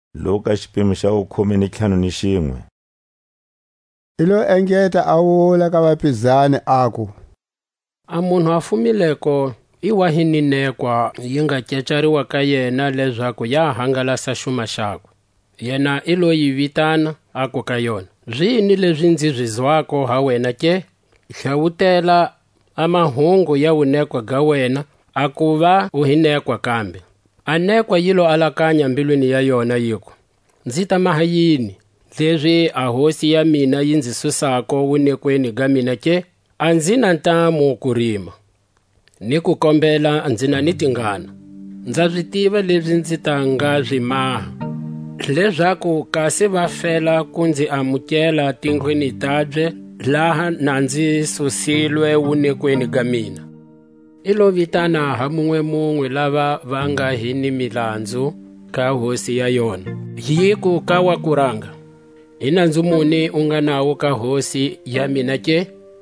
A nekwa leyi yi nga tsumbekangiko. I lo engeta a wula ka vapizani; aku: A munhu a fumileko i wa hi ni nekwa, yi nga kecariwa ka yena, lezaku ya hangalasa xuma xakwe. Yena i lo yi vitana, aku ka yona: Zini lezi nzi zi zwako ha wena ke? Hlawutela a mahungu ya wunekwa ga wena, hakuva a zi koteki a kuva u hi nekwa kambe. A nekwa yi lo alakanya mbilwini ya yona, yiku: Nzi ta maha yini, lezi a hosi ya mina yi nzi susako wunekweni ga mina ke? A nzi na ntamu ku rima, ni ku kombela nzi na ni tingana. Nza zi tiva lezi nzi ta nga zi maha, lezaku kasi va fela ku nzi amukela tindlwini tabye laha na nzi susilwe wunekweni ga mina. Yi lo vitana ha munwe-munwe lava va nga hi ni milanzu ka hosi ya yona; yiku ka wa kuranga: I nanzu muni u nga nawo ka hosi ya mina ke?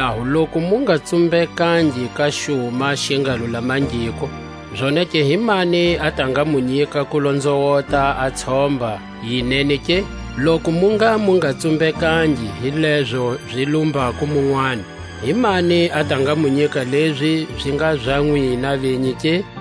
Hikwalaho loku mu nga tsumbekangi ka cuma xi nga lulamangiko, zonake himani a ta nga mu nyika ku lonzowota a tshomba yi nene ke? Loku mu ngha mu nga tsumbekangi hi lezo zi lumbako munwani, himani a ta nga mu nyika lezi zi nga za nwina venyi ke?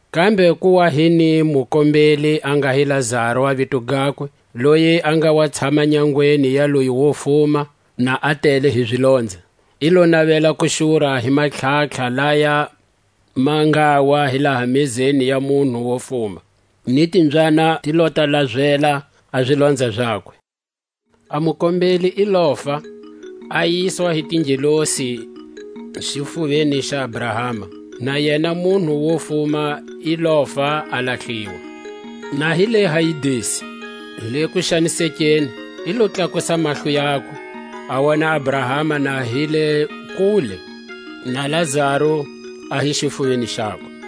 Kambe ku wa hi ni mukombeli, a nga hi Lazaru a vito gakwe, loyi a nga wa tshama nyangweni ya loyi wo fuma, na a tele hi zilonza. I lo navela ku xura hi matlhatlha laya ma ngawa hi laha mezeni ya munhu wo fuma. Ni timbyana ti lo ta lazela a zilonza zakwe. A mukombeli i lofa, a yiswa hi tingelosi xifuveni xa Abrahama; na yena munhu wo fuma i lofa a lahliwa. Na hi le Hayidesi le kuxanisekeni, i lo tlakusa mahlo yakwe, a wona Abrahama na hi le kule, na Lazaru a hi xifuveni xakwe.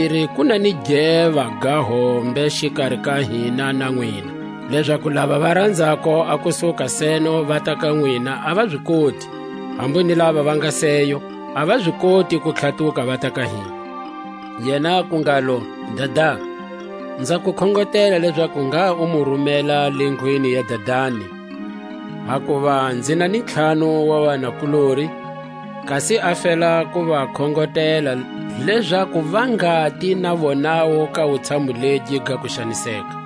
Tlhatakumbiri, ku na ni geva ga hombe xikari ka hina na nwina; lezaku lava va ranzako a ku suka seno vata ka nwina a va zi koti; hambu ni lava va nga seyo, a va zi koti ku tlhatuka vata ka hina. Yena aku ngalo: Dada, nza ku khongotela lezaku ngha u mu rumela le ndlwini ya dadani; hakuva nzi na ni ntlhanu wa vanakulori; kasi a fela ku va khongotela, lezaku va ngati na vonawu ka wutshamu legi ga kuxaniseka.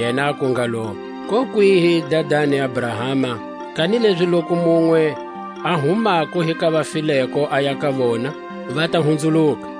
Yena aku ngalo: Kokwihi, dadani Abrahama; kanilezi loku munwe a humako hi ka vafileko aya ka vona, va ta hunzuluka.